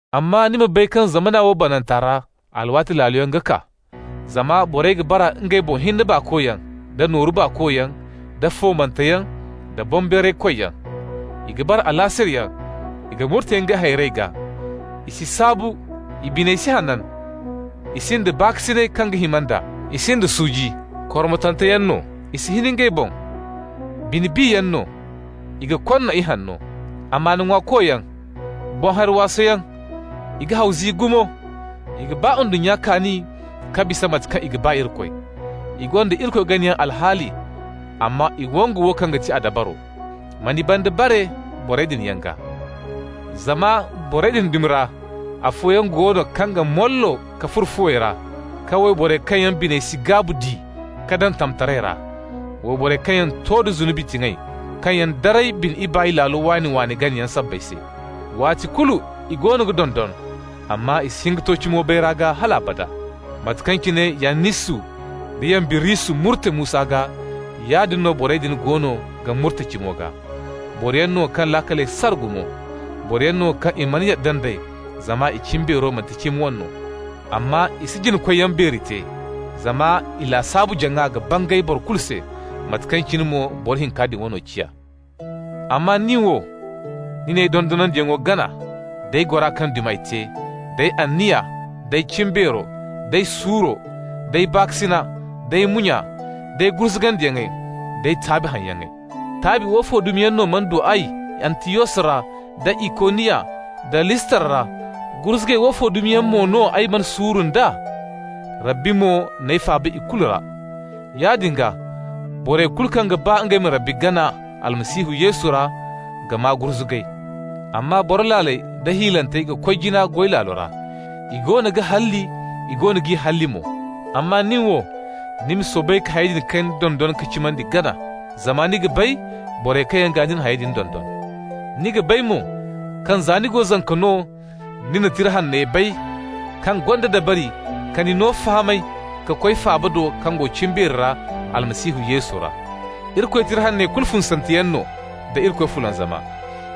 Amma ni ma bay kaŋ zamana wo bananta ra alwaati laaloyaŋ ga kaa. Zama borey ga bara ngey boŋ hinne baakoyaŋ da nooru baakoyaŋ, da foomanteyaŋ, da boŋbeeraykoyyaŋ. I ga bara alaasirayyaŋ, i ga murte ngey hayrey gaa, i si saabu, i biney si hanan. I sinda baakasinay kaŋ ga hima nd'a, i sinda suuji. Kormotanteyaŋ no, i si hin ngey boŋ, bine-biyaŋ no, i ga konna ihanno. Amaana ŋwaakoyaŋ, boŋ-hari-waasoyaŋ, i ga haw zi gumo, i ga ba ndunnya kaani ka bisa mate kaŋ i ga ba Irikoy. I gonda Irikoy ganayaŋ alhaali, amma i wangu wo kaŋ ga ti a dabaro. Ma ni banda bare borey din yaŋ gaa. Zama borey din dumi ra afooyaŋ go no kaŋ ga mollo ka furo fuwey ra ka wayborey kaŋ yaŋ biney si gaabu di ka daŋ tamtaray ra, wayborey kaŋ yaŋ to da zunubi tiŋay, kaŋ yaŋ daray bine ibaay laalo waani-waani ganayaŋ sabbay se. Waati kulu i goono ga dondon, amma i si hin ka to cimo bayra gaa hal abada. Mate kaŋ cine Yannisu nda Yambirisu murte Musa gaa, yaadin mo no borey din goono ga murte cimo gaa. Boroyaŋ no kaŋ laakaley sara gumo. Boroyaŋ no kaŋ i mana yadda nd'ey, zama i cimbeero manti cimi wane no. Amma i si jina-koyyaŋ beeri te, zama i lasaabu-jaŋa ga bangay boro kulu se, mate kaŋ cine mo boro hinka din wano ciya. Amma ni wo, ni n'ay dondonandiyaŋo gana, d'ay gora kaŋ dumi ay te, d'ay anniya, d'ay cimbeero, d'ay suuro, d'ay baakasina, d'ay munya, d'ay gurzugandiyaŋey, d'ay taabi haŋyaŋey. Taabi woofo dumi yaŋ no mana du ay Antiyos ra, da Ikoniya, da Listra ra, gurzugay woofo dumi yaŋ mo no ay mana suuru nd'a? Rabbi mo n'ay faaba i kulu ra. Yaadin gaa, borey kulu kaŋ ga ba ngey ma Irikoy gana Almasihu Yesu ra ga maa gurzugay. Amma boro laaley da hiilantey ga koy jina goy laalo ra. I goono ga halli, i goono g'i halli mo. Amma ni wo, ni ma soobay ka hayey din kaŋ ni dondon ka cimandi gana, zama ni ga bay borey kaŋ yaŋ gaa ni na hayey din dondon. Ni ga bay mo kaŋ za ni go zanka no ni na Tira Hanney bay kaŋ gonda dabari ka ni no fahamay ka koy faaba do kaŋ go cimbeeri ra Almasihu Yesu ra. Irikoy Tira Hanney kulu funsanteyaŋ no nda Irikoy fulanzama.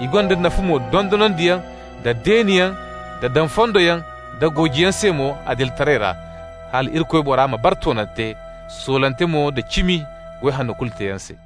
I gonda nafa mo dondonandiyaŋ da deeniyaŋ da daŋ fondoyaŋ da goojiyaŋ se mo adilitaray ra, hala Irikoy bora ma bara toonante, soolante mo da cimi, goy hanno kulu teeyaŋ se.